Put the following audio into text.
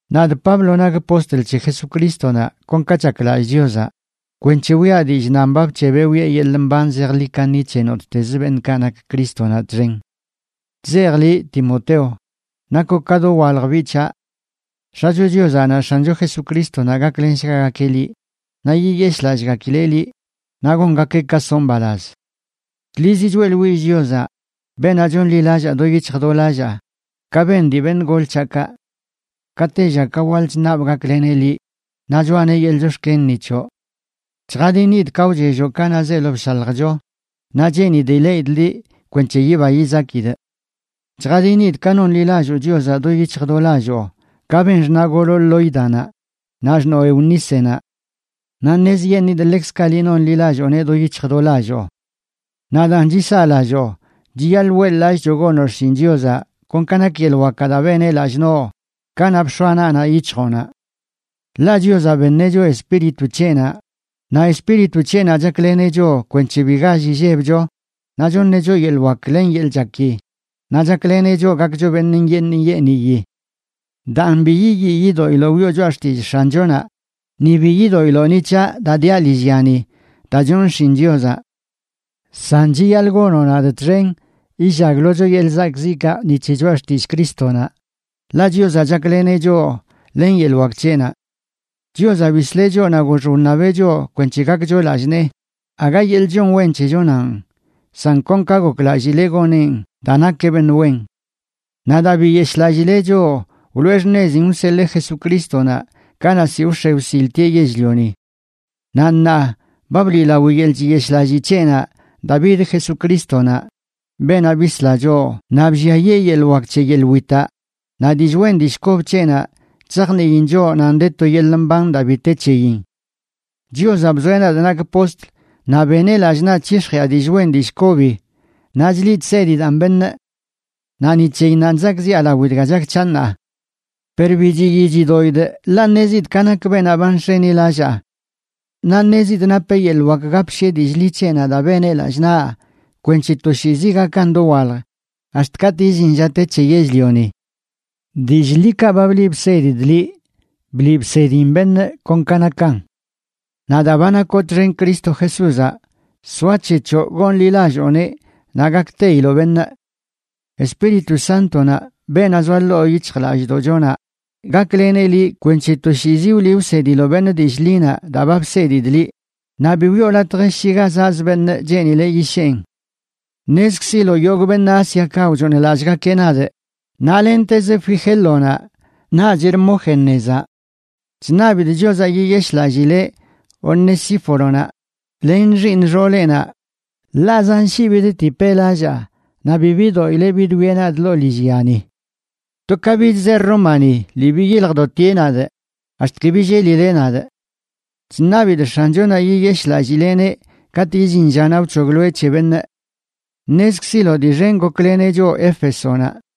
Nadꞌ Pablo nakꞌ postl c̱he Jesucrístonaꞌ kon ka chaklallꞌ Chiozaꞌ, kwenc̱he wiꞌa dillꞌ nan ba bc̱hebeꞌ wiꞌe yeḻꞌ mban zejḻi kaṉi c̱he nottezə beṉꞌkaꞌ nak Crístonaꞌ txen. Chzejꞌ liꞌ, Timoteo, nakoꞌ ka dowalj biꞌ c̱haꞌ. X̱acho Chiozaꞌ naꞌ X̱ancho Jesucrístonaꞌ gaklenshgagakeꞌ liꞌ, naꞌ yiyeshꞌlallꞌgakileꞌ liꞌ, naꞌ gongakeꞌ ka soꞌ mbalaz. Tlizi choeꞌḻwillꞌ Chiozaꞌ, beenaꞌ chonḻilallaa do yic̱hj do lallaa, ka ben dii beṉꞌ gol c̱haꞌkaꞌ. Ka tella ka waḻ chṉabꞌ gakleneꞌ liꞌ naꞌ choꞌaneꞌ yeḻꞌ chox̱ken ni c̱hoꞌ. Chjadinidꞌ ka wchelloꞌ kanaꞌ zeelo bshaljcho, naꞌ cheenidꞌ ileꞌidꞌ liꞌ kwenc̱he yiba yizakidꞌ. Chjadinidꞌ ka nonḻilalloo Chiozaꞌ do yic̱hj do lalloo, ka ben xṉaꞌgoloꞌ Lóidanaꞌ naꞌ xṉoo, Eunícenaꞌ. Naꞌ ṉezyeṉidꞌ ḻekzkaꞌ liꞌ nonḻilallooneꞌ do yic̱hj do lalloo. Naꞌ daan, chisaꞌlalloo chiyaḻꞌ weꞌḻ-lallꞌcho gonoꞌ xshin Chiozaꞌ kon ka nak yeḻꞌ wakaꞌ daa beneꞌ lallꞌ noꞌ kanaꞌ bx̱oaꞌ naꞌnaꞌ yic̱hjoꞌnaꞌ. Ḻaꞌ Chiozaꞌ beṉeꞌ choꞌ Espíritu c̱heꞌnaꞌ, naꞌ Espíritu c̱heꞌnaꞌ chakleneꞌ choꞌ kwenc̱he bi gall illebcho, naꞌ choṉeꞌ choꞌ yeḻꞌ wak len yeḻꞌ chaki, naꞌ chakleneꞌ choꞌ gakcho beṉꞌ nyeeṉ nyeeniyi. Daan, bi yiyii yidoꞌiloꞌ wiꞌo choꞌa xtillꞌ X̱anchonaꞌ, ni bi yidoꞌiloꞌ ni c̱haꞌ daa diaꞌ lillyani daa chonꞌ xshin Chiozaꞌ. San chiyaḻꞌ gonoꞌ nadꞌ txen illaglocho yeḻꞌ zakꞌziꞌkaꞌ ni c̱he choꞌa xtillꞌ Crístonaꞌ, ḻaꞌ Chiozaꞌ chakleneꞌ choꞌ len yeḻꞌ wak c̱heꞌnaꞌ. Chiozaꞌ bisleꞌ choꞌ naꞌ gox wṉabeꞌ choꞌ kwenc̱he gakcho lallꞌ nee, aga yeḻꞌ chon wen c̱hechonanꞌ, san kon ka goklallileꞌ goneꞌn daa nakeꞌ beṉꞌ wen. Naꞌ daa biyeshꞌlallileꞌ choꞌ wloꞌe xṉezin wseḻee Jesucrístonaꞌ kanaꞌ ziꞌ wx̱e wsiltieꞌ yell-lioni. Naꞌ ṉaa, ba bliꞌlawi yeḻꞌ chiyeshꞌlallii c̱heꞌnaꞌ daa bid Jesucrístonaꞌ, beenaꞌ bisla choꞌ, naꞌ blliayee yeḻꞌ wak c̱he yeḻꞌ witaꞌ, naꞌ dillꞌ wen dillꞌ kob c̱heꞌnaꞌ chzajniin choꞌ nan de to yeḻꞌ mban daa bi te c̱heyin. Chiozaꞌ bzoeꞌ nadꞌ nakꞌ postl naꞌ beneꞌ lallꞌ naꞌ chyix̱jiꞌa dillꞌ wen dillꞌ kobi naꞌ chliꞌ chsedidaꞌn beṉꞌ. Naꞌ ni c̱heyinnanꞌ chzakꞌziꞌa lao dga chak c̱haꞌ ṉaa. Per bi chiyii chidoꞌidꞌ, ḻaꞌ ṉezidꞌ ka nak beenaꞌ ba nx̱enilallaa. Naꞌ ṉezidꞌ napeꞌ yeḻꞌ wak gapshiꞌe dillꞌ ḻi c̱heꞌnaꞌ daa beneꞌ lallꞌ naꞌ, kwenc̱he toshiizi gakan dowalj ax̱t katꞌ illin lla te c̱he yell-lioni. Dillꞌ ḻikaꞌ ba bliꞌ bsedidꞌ liꞌ, bliꞌ bsediꞌn beṉꞌ kon ka nakan. Naꞌ daa ba nakoꞌ txen Cristo Jesúzaꞌ, soac̱hechoꞌ gonḻilallooneꞌ naꞌ gakteiloꞌ beṉꞌ. Espíritu Sántonaꞌ, beenaꞌ zoa ḻoo yic̱hjlallꞌdoꞌchonaꞌ, gakleneꞌ liꞌ kwenc̱he toshiizi wliꞌ wsediloꞌ beṉꞌ dillꞌ ḻinaꞌ daa ba bsedidꞌ liꞌ naꞌ bi wiꞌo latj shi ga zaꞌzə beṉꞌ cheenileꞌ yisheen. Ṉezkziloꞌ yogꞌ beṉꞌ Ásiakaꞌ wchooṉlallꞌgakeꞌ nadꞌ, naꞌ lentez Figélonaꞌ naꞌch Hermógenezaꞌ. Chṉabidꞌ Chiozaꞌ yiyeshꞌlallileꞌ Onesíforonaꞌ len xiiṉ xooleꞌnaꞌ, ḻaꞌ zan shii bidtipeꞌ lallaa naꞌ bi bidoꞌileꞌ bidwieꞌ nadꞌ ḻoo lillyani. To ka bidzeꞌ Rómani, lii biyiljdotieꞌ nadꞌ ax̱t ki billelileꞌ nadꞌ. Chṉabidꞌ X̱anchonaꞌ yiyeshꞌlallileꞌneꞌ katꞌ illin llanaꞌ wc̱hogloeꞌ c̱he beṉꞌ. Ṉezkziloꞌ dii xen gokleneꞌ choꞌ Éfesonaꞌ.